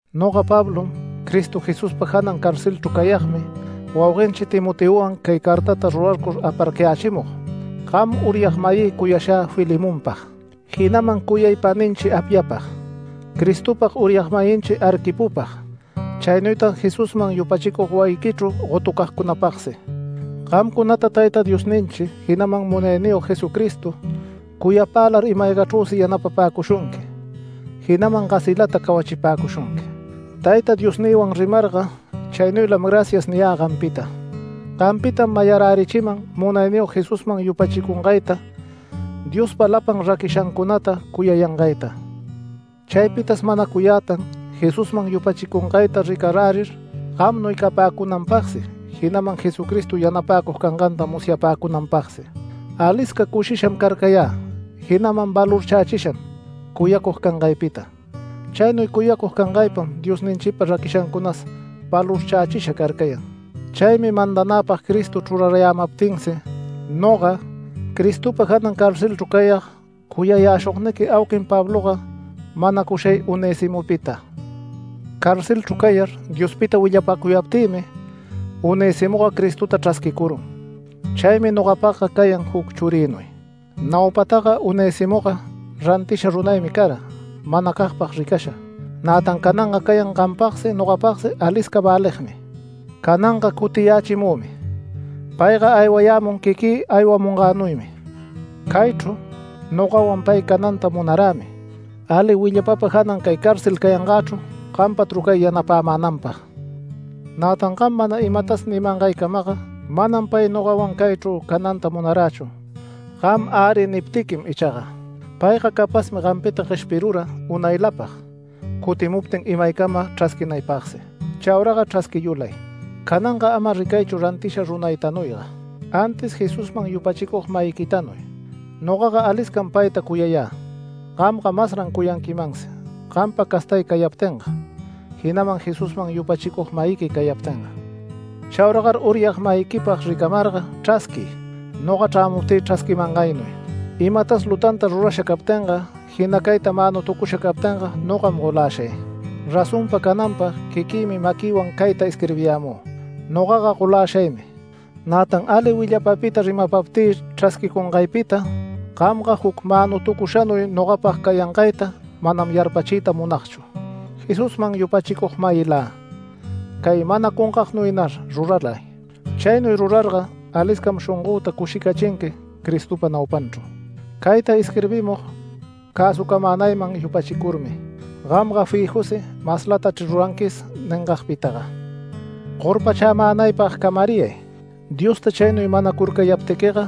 Noga Pablom, Cristo Jesuspa janan carcelchru cayagmi, wauguenchi Timoteowan cay cartata rurarcur aparcayächimug, gam uryag-mayï cuyashä Filemonpag, jinaman cuyay paninchi Apiyapag, Cristopag uryag-mayinchi Arquipopag, chaynuytag Jesusman yupachicug wayiquichru gotucagcunapagsi. Gamcunata Tayta Diosninchi, jinaman Munayniyog Jesucristo cuyapälar ima-aygachrüsi yanapapäcushunqui, jinaman gasilata cawachipäcushunqui. Tayta Diosnïwan rimarga chaynuylam “Gracias” niyä gampita. Gampitam mayarärichiman Munayniyog Jesusman yupachicungayta, Diospa lapan raquishancunata cuyayangayta. Chaypitas manacuyätan Jesusman yupachicungayta ricarärir gamnuy capäcunanpagsi, jinaman Jesucristo yanapäcug canganta musyapäcunanpagsi. Alisca cushisham carcayä jinaman valorchächisham cuyacug cangaypita. Chaynuy cuyacug cangaypam Diosninchipa raquishancunas valorchächisha carcayan. Chaymi mandanäpag Cristo chrurarayämaptinsi, noga Cristopa janan carcelchru cayag cuyayäshugniqui auquin Pabloga, manacushay Onesimopita. Carcelchru cayar Diospita willapacuyaptïmi Onesimoga Cristota chrasquicurun. Chaymi nogapagga cayan juc churïnuy. Naupataga Onesimoga rantisha runaymi cara manacagpag ricasha, nätan cananga cayan gampagsi, nogapagsi alisca väligmi. Cananga cutiyächimümi. Payga aywayämun quiquï aywamungänuymi. Caychru nogawan pay cananta munarämi, ali willapapa janan cay cárcel cayangächru gampa trucay yanapämänanpag. Nätan gam mana imatas nimangaycamaga, manam pay nogawan caychru cananta munarächu, gam “Äri” niptiquim ichaga. Payga capazmi gampita gueshpirura unaylapag, cutimuptin imaycama chrasquinaypagsi. Chauraga chrasquiyulay. Cananga ama ricaychu rantisha runaytanuyga, antis Jesusman yupachicug-mayiquitanuy. Nogaga aliscam payta cuyayä, gamga masran cuyanquimansi gampa castay cayaptinga, jinaman Jesusman yupachicug-mayiqui cayaptinga. Chauragar uryag-mayiquipag ricamarga chrasquiy, noga chrämuptï chrasquimangaynuy. Imatas lutanta rurasha captinga, jina cayta manutucusha captinga nogam goläshay. Razonpa cananpag quiquïmi maquïwan cayta isquirbiyämü, nogaga goläshaymi. Nätan ali willapapita rimaptï chrasquicungaypita gamga juc manutucushanuy nogapag cayangayta manam yarpachiyta munagchu. Jesusman yupachicug-mayilä, cay manacungagnuynar ruralay. Chaynuy rurarga aliscam shongöta cushicachinqui Cristopa naupanchru. Cayta isquirbimug cäsucamänayman yupachicurmi ¡gamga fijusi maslatachri ruranquis ningagpitaga! Gorpachämänaypag camariyay, Diosta chaynuy manacurcayaptiquiga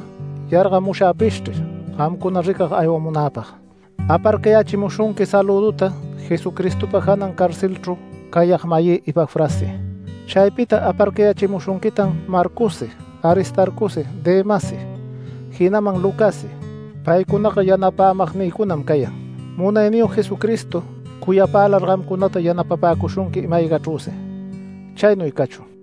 yargamushagpishchri gamcuna ricag aywamunäpag. Aparcayächimushunqui salüduta Jesucristopa janan carcelchru cayag-mayï Epafrassi. Chaypita aparcayächimushunquitan Marcossi Aristarcosi Demassi, jinaman Lucassi. Paycunaga yanapämagnïcunam cayan. Munayniyog Jesucristo cuyapälar gamcunata yanapapäcushunqui ima-aygachrüsi. Chaynuy cachun.